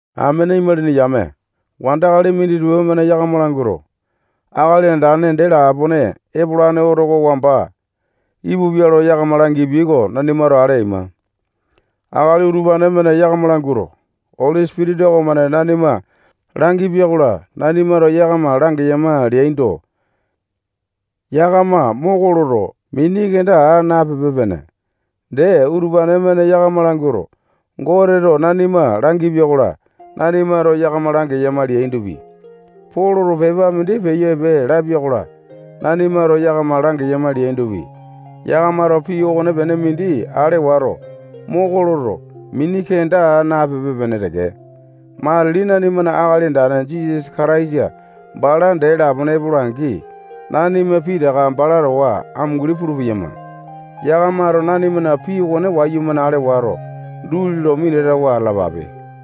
Amene imalini yame, wandakali minditupa-mane yakama languato, Akali Andane dee lapone epolane oto oko wamba ipupia lo yakama langipia oko nanimato ale aima. Akali utupane-mane yakama languato, Oli Sipitisa okomane nanima langipia-kola, nanimato yakama langeyama leaindo, yakama moko loto, mini kenda aa napipe-pene. Dee, utupane-mane yakama languato, Goteto nanima langipia-kola, nanimato yakama langeyama leaindopi, Poloto pepa mindi peyo epe lapia-kola, nanimato yakama langeyama leaindopi, yakamato pii okonepene mindi ale wato, moko loto, mini kenda aa napipe-pene teke. Matili nanimana Akali Andane Jisasa Kataisa bala dee lapone epola-angi, nanima pitaka bala towa amunguli pulu-peyama. Yakamato nanimana pii okone wayumane ale wato, duli lo minatawa atalapape.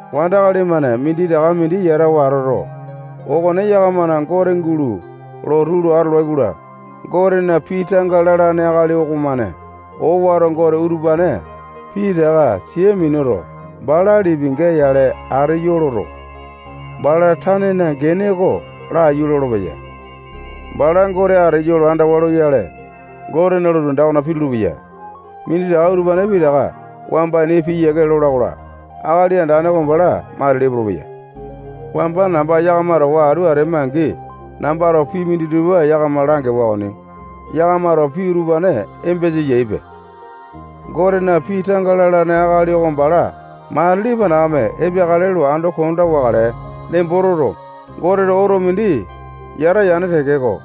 Wandakali-mane minditaka mindi yatawa atoto, okone yakamana gote gulo lotu lo atolai-kola, Gotena pii tanga lalane akali okomane owato gote utupane pitaka sia minuto, bala lipinga yale ateyo loto, bala tanena gene oko laiyu lolopeya. Bala gote ateyo lo andawa loyale, Gotena lotu anda okona pitulu-peya. Minditaka utupane pitaka wamba ini piyiake lola-kola, Akali Andane oko bala matili epolopeya. Wamba namba yakama towa atu atema-angi, nambato pii minditupa yakama langewa okoni. Yakamato pii utupane embesa eyaipe. Gotena pii tanga lalane akali oko bala matili panakame epeakale lo ando konda wakale nembo toto, Goteto oto mindi yata yane tekeko,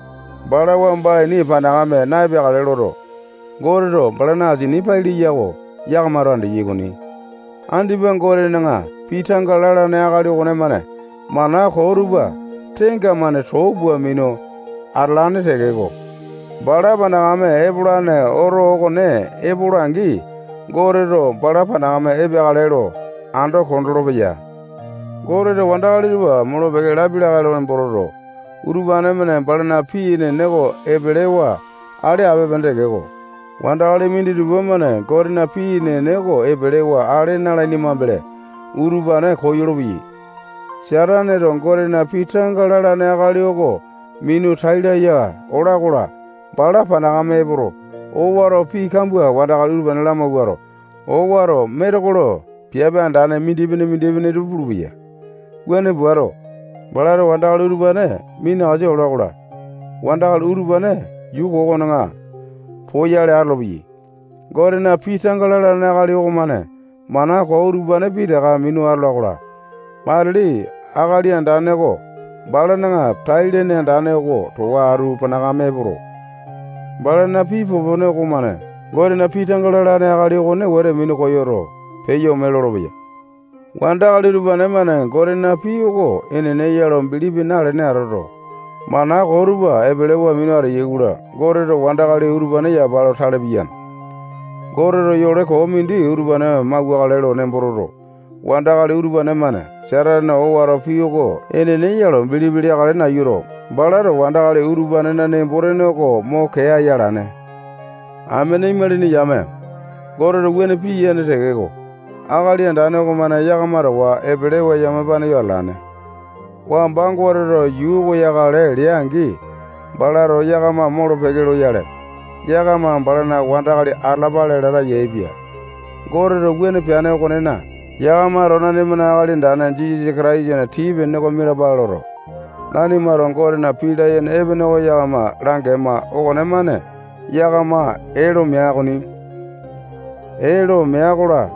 bala wamba ini panakame na-epeakale loto, Goteto balana asini pai leya oko yakamato andeyai okoni. Andipa Gotena pii tanga lalane akali okonemane mana koo tupa tenga-mane too pua minu atalane tekeko, bala panakame epolane oto okone epola-angi, Goteto bala panakame epeakale lo ando kondolo-peya. Goteto wandakali tupa molo-peke lapia lakae lo nembo toto, utupane-mane balana pii enene oko epelewa ale ape-pene tekeko, wandakali minditupa-mane Gotena pii enene oko epelewa ale na-alaini mambele utupane koyolo-peyai. Sataneto Gotena pii tanga lalane akali oko minu tai laya ola-kola, bala panakame epoto, owato pii kambua wandakali utupane lamawuato, owato metekolo piape andane mindipene-mindipene tupa pulupeya. Wuane puato, balato wandakali utupane minakasa ola-kola, wandakali utupane yuu koo okona poyale atolopeyai. Gotena pii tanga lalane akali okomane mana koo utupane pitaka minu atola-kola, matili Akali Andane oko balana tai-lene andane oko towa atu panakame epoto, balana pii popone okomane Gotena pii tanga lalane akali okone wete minu koyoto, peyo ome lolopeya. Wandakali utupane-mane Gotena pii oko enene ya lo bilipi nalene atoto, mana koo tupa epelewa minu ateyai-kola, Goteto wandakali utupane yapa lo tale piyane. Goteto yole koo mindi utupane mauwakale nembo toto, wandakali utupane-mane Satanena owato pii oko enene ya lo bilipi leakale nayuto, balato wandakali utupanena nembo-tene oko mo kee aya alane. Amene imalini yame, Goteto wuane piyane tekeko, Akali Andane okomane yakama towa epelewa yamapane yo atalane. Wamba Goteto yuu oko yakale lea-angi, balato yakama molo-peke loyale, yakama balana wandakali atalapale lata yaepia. Goteto wuane peane okonena, yakamato nanimana Akali Andane Jisasa Kataisana tii-pene oko mialapale loto, nanimato Gotena pii layene epene oko yakama langema okonemane yakama ee lo mea okoni. Ee lo mea-kola,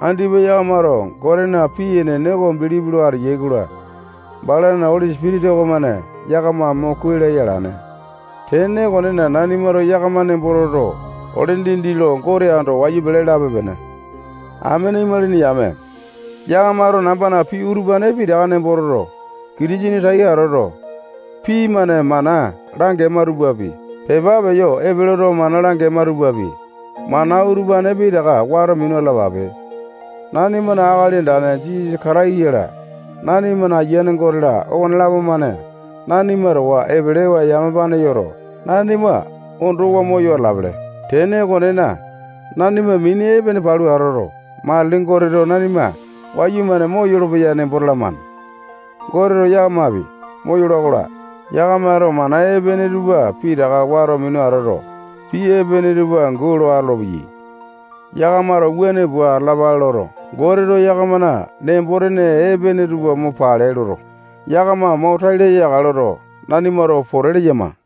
andipa yakamato Gotena pii enene oko bilipi lo ateyai-kola, balana Oli Sipitisa okomane yakama mo kuai laya alane. Tene okonena, nanimato yakama nembo toto, ole dindi lo Gote ando wayu pele lape-pene. Amene imalini yame, yakamato nambana pii utupane pitaka nembo toto, Kitisene tai atoto, pii-mane mana langema tupapi, pepa peyo epe loto, mana langema tupapi, mana utupane pitaka wato minu atalapape. Nanimana Akali Andane Jisasa Kataisa-la, nanimana Ayiane Gote-la, okonelapo-mane nanima towa epelewa yamapane yoto, nanima ondowa moyo atalapele. Tene okonena, nanima mini epene palu atoto, matili Goteto nanima wayumane moyolo-peya nembo talamane. Goteto yakamapi moyola-kola, yakamato mana epene tupa pitaka wato minu atoto, pii epene tupa angu lo atolopeyai. Yakamato wuane pua atalapale loto, Goteto yakamana nembo-tene epene tupa mo pale loto, yakama mo tai laya yakale loto, nanimato pote leyama.